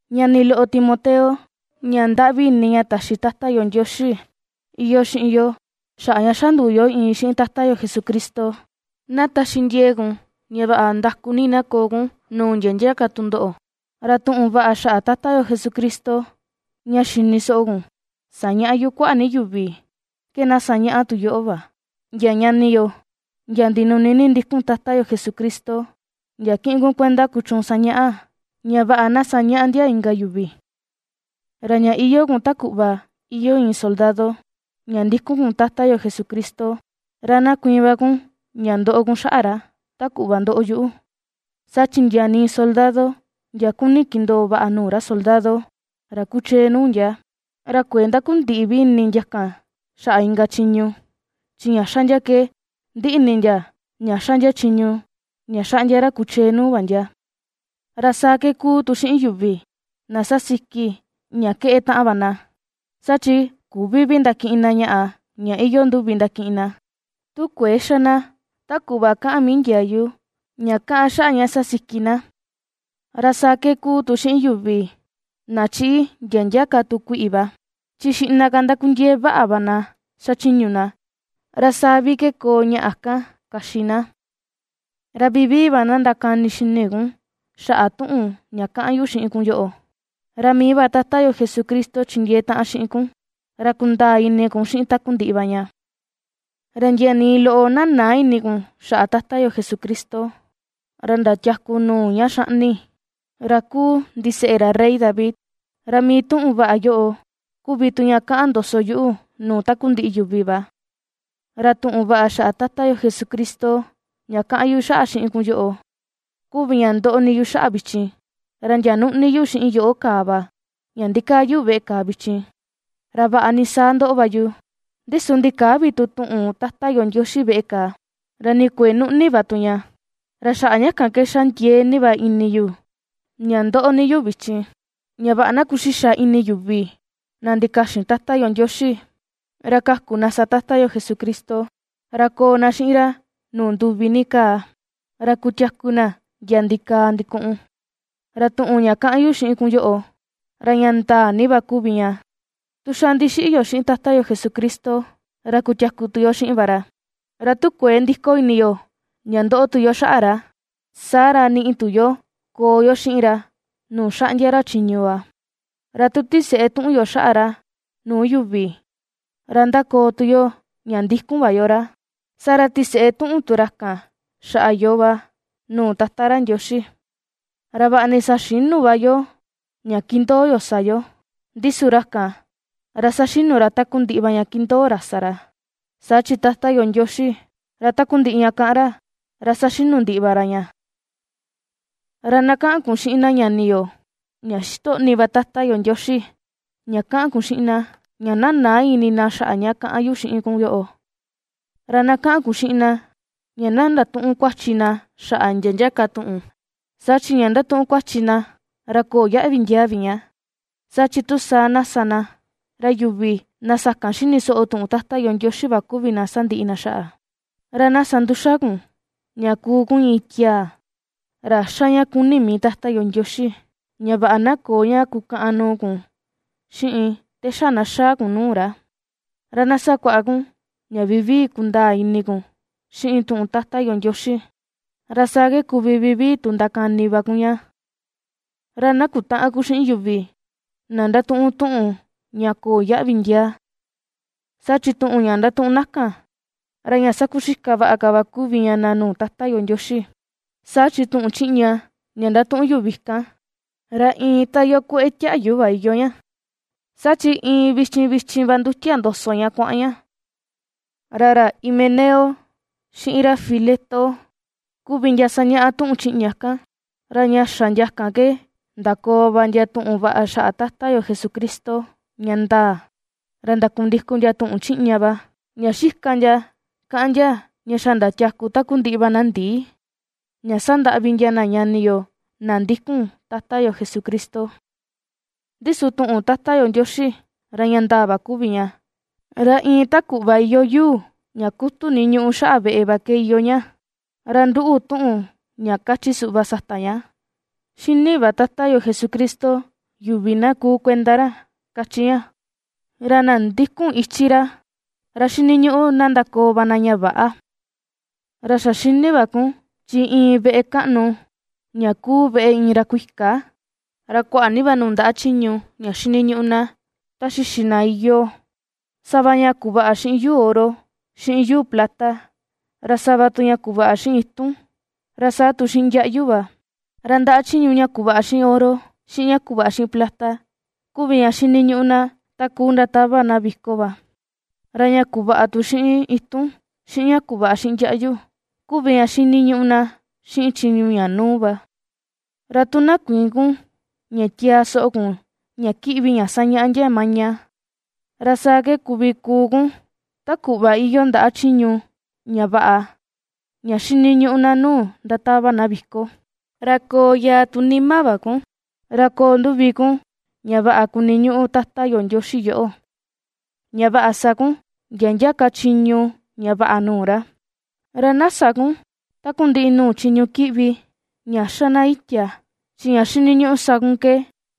Ñani loꞌo Timoteo, ña ndaꞌvi ini ña taxi Tata yo Ndioxi iyoo xiꞌin yo xaꞌa ña xa nduu yo iin xiꞌin Tata yo Jesucristo, na taxi ndiee kun ña vaꞌa nda̱ku̱ ni na koo kun nuu ndia ndia ka tundoꞌo. Ra tuꞌun vaꞌa xaꞌa Tata yo Jesucristo ña xini soꞌo kun sañaꞌa yu kuaꞌa ni yuvi ke na sañaꞌa tu yoꞌo va ndia ñani yo, ndia ndinuni ni ndikun Tata yo Jesucristo, ndia kiꞌin kun kuenda kuchuun sañaꞌa, ña vaꞌa na sañaꞌa ndia inka yuvi. Ra ña iyoo kun ta kuꞌva iyoo iin soldado ña ndikun kun Tata yo Jesucristo, ra na kuiin va kun ña ndoꞌo kun xaꞌa ra, ta kuꞌva ndoꞌo yuꞌu. Saa chi ndia nii soldado ndia kuni kindoo vaꞌa nuu ra soldado, ra kuchee nuu ndia, ra kuëe ndakundiꞌi vi ini ndia kan xaꞌa inka chiñu, chi ña xa ndia ke ndiꞌi ini ndia ña ^xa ndia chiñu ña ^xaꞌndia ra kuchee nuu va ndia. Ra saa ke ^kuu tu xiꞌin yuvi na ^sasiki ña keꞌe taꞌan va na, saa chi küvi vi ndakiꞌin na ñaꞌa ña iyoo nduvi ndakiꞌin na, tu kuëe xa na ta kuꞌva kaꞌan mii ndiayu ña kaꞌan xaꞌa ña sasiki na. Ra saa ke ^kuu tu xiꞌin yuvi na ^chiꞌi ndia ndia ka tu kuiꞌi va, chi xiꞌna ka ^ndakundiee vaꞌa va na xachiñu na, ra saa vi ke koo ñaꞌa kan kaxi na. Ra vivii va na ndakani xini kun xaꞌa tuꞌun ña kaꞌan yu xiꞌin kun yoꞌo, ra mii va Tata yo Jesucristo chindiee taꞌan xiꞌin kun, ra kundaa ini kun xiꞌin takundiꞌi va ña. Ra ndia nii loꞌo na näa ini kun xaꞌa Tata yo Jesucristo, ra ndatiaku nuu ña ^xaꞌni, ra ^kuu ndiseꞌe ra rey David. Ra mii tuꞌun vaꞌa yoꞌo kuvi tu ña ^kaꞌan ndoso yuꞌu nuu takundiꞌi yuvi va. Ra tuꞌun vaꞌa xaꞌa Tata yo Jesucristo ña ^kaꞌan yu xaꞌa xiꞌin kun yoꞌo, kuvi ña ndoꞌo ni yu xaꞌa vichin, ra ndia nuꞌni yu xiꞌin yoꞌo kàà va, ña ndikaa yu veꞌe kàà vichin; ra vaꞌa ni saa ndoꞌo va yu, ndi su ndikäa vi tu tuꞌun Tata yo Ndioxi veꞌe kàà, ra ni kuëe nuꞌni va tu ña. Ra xaꞌa ña kan ke ^xa ndiee ni va ini yu ña ^ndoꞌo ni yu vichin, ña vaꞌa na ^kuxixa ini yuvi na ndikaxin Tata yo Ndioxi, ra kaku na sa Tata yo Jesucristo, ra koo na xiꞌin ra nuu nduvi ni kaa, ra kutiaku na ndia ndikaa ndikuꞌun. Ra tuꞌun ña kaꞌan yu xiꞌin kun yoꞌo, ra ña ndaa ni va kuvi ña: Tu xa ndixiꞌi yo xiꞌin Tata yo Jesucristo, ra kutiaku tu yo xiꞌin va ra; ra tu kuëe ndiko ini yo ña ^ndoꞌo tu yo xaꞌa ra, saa ra niꞌi tu yo koo yo xiꞌin ra nuu xaꞌndia ra chiñu va. Ra tu ^tiseꞌe tuꞌun tu yo xaꞌa ra nuu yuvi, ra ndakoo tu yo ña ndikun va yo ra, saa ra tiseꞌe tuꞌun tu ra kan xaꞌa yoo va nuu Tata ra Ndioxi. Ra vaꞌa ni saxïnu va yoo ña kindoo yo sa yo, ndi su ra kan, ra ^saxinu ra takundiꞌi va ña ^kindoo ra sa ra. Saa chi Tata yo Ndioxi, ra takundiꞌi ña kaꞌan ra, ra saxinu ndiꞌi va ra ña. Ra na kaꞌan kun xiꞌin na ñani yo, ña xitoꞌni va Tata yo Ndioxi, ña kaꞌan kun xiꞌin na, ña na näa ini na xaꞌa ña kaꞌan yu xiꞌin kun yoꞌo, ra na kaꞌan kun xiꞌin na, ña na ndatüꞌun kuachi na xaꞌa ndia ndia ka tuꞌun, saa chi ña ndatuꞌun kuachi na, ra köo yaꞌvi ndiaa vi ña, saa chi tu saa na sa na, ra yuvi na sakan xini soꞌo tuꞌun Tata yo Ndioxi va kuvi na sandiꞌi na xaꞌa. Ra na sa nduxa kun, ña kuu kun iin tiaa, ra ^xa ña kuni mii Tata yo Ndioxi, ña vaꞌa na köo ña kukaꞌan nuu kun xiꞌin te xa na xaa kun nuu ra. Ra na sakuaꞌa kun ña vivii kundaa ini kun xiꞌin tuꞌun Tata yo Ndioxi, ra saa ke kuvi vivii tu ndakani va kun ña. Ra na kutäꞌan kun xiꞌin yuvi na ndatuꞌun tuꞌun ña köo yaꞌvi ndiaa, saa chi tuꞌun ña ndatuꞌun na kan, ra ña sakuxika vaꞌa ka va kuvi ña na nuu Tata yo Ndioxi. Saa chi tuꞌun chiꞌña ña ndatuꞌun yuvi kan, ra iin ta iyoo kueꞌe tiaꞌyu va iyoo ña, saa chi iin vichin vichin va ndutia ndoso ña kuaꞌan ña. Ra ra Himeneo xiꞌin ra Fileto kuvi ndia ^sañaꞌa tuꞌun chiꞌña kan, ra ña xa ndia ke ndakoo va ndia tuꞌun vaꞌa xaꞌa Tata yo Jesucristo, ña ndaa, ra ndakundikun ndia tuꞌun chiꞌña va, ña xika ndia kaꞌan ndia ña xa ndatiaku takundiꞌi va na ndii, ña ^sandaꞌvi ndia na ñani yo na ndikun Tata yo Jesucristo. Ndi su tuꞌun Tata yo Ndioxi, ra ña ndaa va kuvi ña, ra iin ta kuꞌva iyoo yuu ña kutu ni ñuꞌu xaꞌa veꞌe va ke iyoo ña, ra nduꞌu tuꞌun ña kachi suꞌva sata ña: “^Xini va Tata yo Jesucristo yuvi na kuu kuenda ra”, kachi ña, ra, “Na ndikun ichi ra, ra xiniñuꞌu na ndakoo va na ña väꞌa.” Ra xa xini va kun, chi iin veꞌe kaꞌnu ña kuu veꞌe iin ra kuika, ra kuaꞌa ni va nuu ndaꞌa chiñu ña xiniñuꞌu na ta xixi na iyoo, sava ña kuvaꞌa xiꞌin yuu oro, xiꞌin yuu plata, ra sava tu ña kuvaꞌa xiꞌin itun, ra saa tu xiꞌin ndiaꞌyu va; ra ndaꞌa chiñu ña kuvaꞌa xiꞌin oro, xiꞌin ña kuvaꞌa xiꞌin plata kuvi ña xiniñuꞌu na ta kuu ndatava na viko va, ra ña kuvaꞌa tu xiꞌin itun, xiꞌin ña kuvaꞌa xiꞌin ndiaꞌyu kuvi ña xiniñuꞌu na xiꞌin chiñu ña nuu va. Ra tu na kuïin kun ña tiaa soꞌo kun ña kiꞌvi ña sañaꞌa ndia maña, ra saa ke kuvi kuu kun ta kuꞌva iyoo ndaꞌa chiñu ña vaꞌa ña xiniñuꞌu na nuu ndatava na viko. Ra koo yaa tu nima va kun, ra koo nduvi kun ña vaꞌa kuniñuꞌu Tata yo Ndioxi yoꞌo, ña vaꞌa sa kun ndia ndia ka chiñu ña vaꞌa nuu ra. Ra na sä kun takundiꞌi nuu chiñu kiꞌvi ña ^xa na itia, chi ña xiniñuꞌu sa kun ke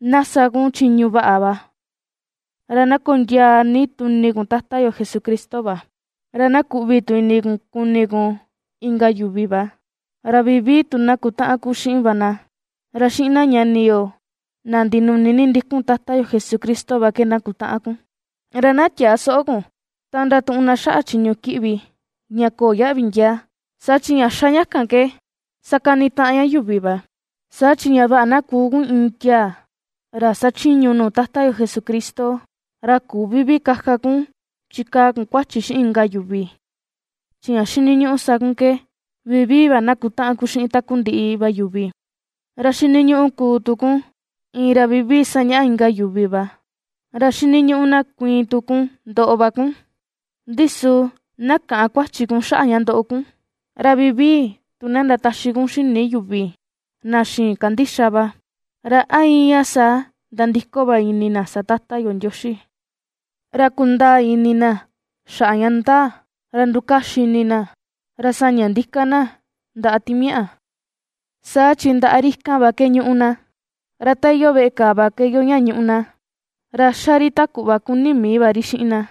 na sa kun chiñu vaꞌa va, ra na kondiaa ni tu ini kun Tata yo Jesucristo va, ra na kuꞌvi tu ini kun kuni kun inka yuvi va, ra vivii tu na kutaꞌan kun xiꞌin va na, ra xiꞌin na ñani yo na ndinuni ni ndikun Tata yo Jesucristo va ke na kutaꞌan kun. Ra na tiäa soꞌo kun ta ndatuꞌun na xaꞌa chiñu kiꞌvi ña köo yaꞌvi ndiaa, saa chi ña ^xa ña kan ke, sakanitaꞌan ña yuvi va. Saa chi ña vaꞌa na kuu kun iin tiaa, ra xachiñu nuu Tata yo Jesucristo, ra küvi vi kaka kun chikaa kun kuachi xiꞌin inka yuvi; chi ña xiniñuꞌu sa kun ke vivii va na kutaꞌan kun xiꞌin takundiꞌi va yuvi. Ra xiniñuꞌu kuu tu kun, iin ra vivii sañaꞌa inka yuvi va; ra xiniñuꞌu na kuiin tu kun ndoꞌo va kun, ndi su na käꞌan kuachi kun xaꞌa ña ndoꞌo kun, ra vivii tu na ndataxi kun xini yuvi na xïin kandixa va, ra a íin ña saa nandiko va ini na sa Tata yo Ndioxi, ra kundaa ini na xaꞌa ña ndaa, ra ndukaxi ini na, ra saña ndika na ndaꞌa timiaꞌa, saa chi ndaꞌa ri kan va ke ñúꞌu na, ra ta iyoo veꞌe kàà va ke iyoo ña ñúꞌu na, ra xa ri ta kuꞌva kuni mii va ri xiꞌin na.